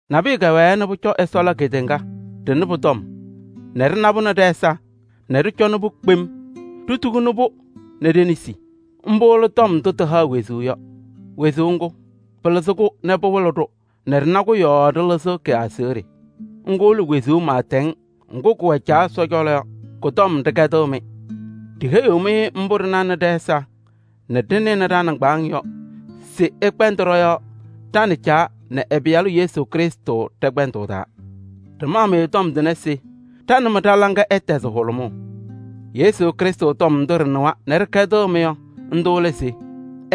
Nabʋyʋ kɛwɛɛ nɛ pʋcɔ Ɛsɔ la kedeŋa, ɖɩnɩ pʋ-tɔm nɛ ɖɩna-pʋ nɛ ɖɛ-ɛza nɛ ɖɩcɔnɩ-pʋ kpem, ɖitukuni-pʋ nɛ ɖe-nesi. Mbʋ lɛ Tɔm ndʋ tɩhaɣ wezuu yɔ. Wezuu ŋgʋ, pɩlɩzɩ-kʋ nɛ pɩwɩlɩ-ɖʋ nɛ ɖɩna-kʋ yɔɔ ɖɩlɩzɩɣ kɩ-aseɣɖe. Ŋgʋ lɛ wezuu pɩɩtɛŋ ŋgʋ kʋwɛ Caa Ɛsɔ cɔlɔ yɔ, kʋ-tɔm ɖɩkɛdɩɣ-mɩ. Ɖiheyiɣ-mɩ mbʋ ɖɩnanɩ ɖɛ-ɛza nɛ ɖɩnɩnɩ ɖa-nɩŋgbaaŋ yɔ se ɩkpɛndɩ ɖɔ-yɔɔ ɖa nɛ Caa nɛ ɛ-Pɩyalʋ Yesu Krɩstʋ ɖɛ-kpɛndʋʋ taa. Ɖɩmaɣ-mɩ tɔm tʋnɛ se ɖa nɛ mɩ ɖa-laŋa ɛtɛzɩ hʋlʋmʋʋ. Yesu Krɩstʋ tɔm ndʋ ɖɩnɩwa nɛ ɖɩkɛdɩɣ-mɩ yɔ, ndʋ lɛ se: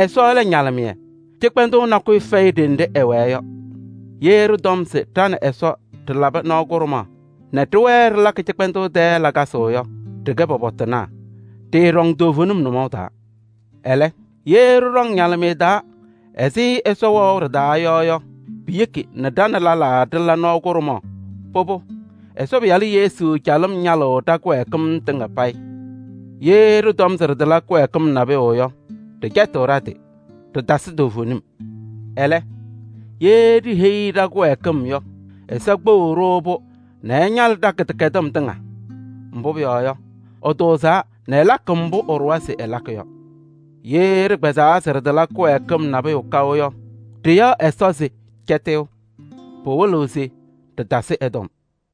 Ɛsɔ lɛ ñalɩmɩyɛ, cɩkpɛndʋʋ nakʋyʋ fɛyɩ ɖenɖe ɛwɛɛ yɔ. Ye ɖɩtɔm se ɖa nɛ Ɛsɔ ɖɩlabɩ nɔɔ kʋɖʋmaɣ nɛ ɖɩwɛɛ ɖɩlakɩ cɩkpɛndʋʋ tɛɛ lakasɩ yɔ, ɖɩkɛ pɔpɔtɩnaa, ɖɩɩɖɔŋ toovenim nʋmɔʋ taa. Ɛlɛ, ye ɖɩɖɔŋ ñalɩmɩyɛ taa ɛzɩ Ɛsɔ wɛʋ ɖɩ-taa yɔ yɔ, piyeki nɛ ɖa nɛ lɛlaa ɖɩla nɔɔ kʋɖʋmaɣ. Pʋbʋ, Ɛsɔ Pɩyalʋ Yesu calɩm ñalɩɣ ɖa-kɩwɛɛkɩm tɩŋa payɩ. Ye ɖɩtɔm se ɖɩtala kɩwɛɛkɩm nabʋyʋ yɔ, ɖɩcɛtɩɣ ɖa-tɩ, ɖɩtasɩ toovenim. Ɛlɛ, ye ɖiheyi ɖa-kɩwɛɛkɩm yɔ, Ɛsɔ kpeɣiɣ-ɖʋ-pʋ nɛ ɛñalɩ ɖa-kɩdɛkɛdɩm tɩŋa. Mbʋ pʋyɔɔ yɔ, ɛtʋʋzaa nɛ ɛlakɩ mbʋ ɛɖʋwa se ɛlakɩ yɔ. Ye ɖɩkpɛzaa se ɖɩtala kɩwɛɛkɩm nabʋyʋ kaʋ yɔ, ɖɩyaɣ Ɛsɔ se cɛtɩyʋ, pɩwɩlɩɣ se ɖɩtasɩ ɛ-tɔm.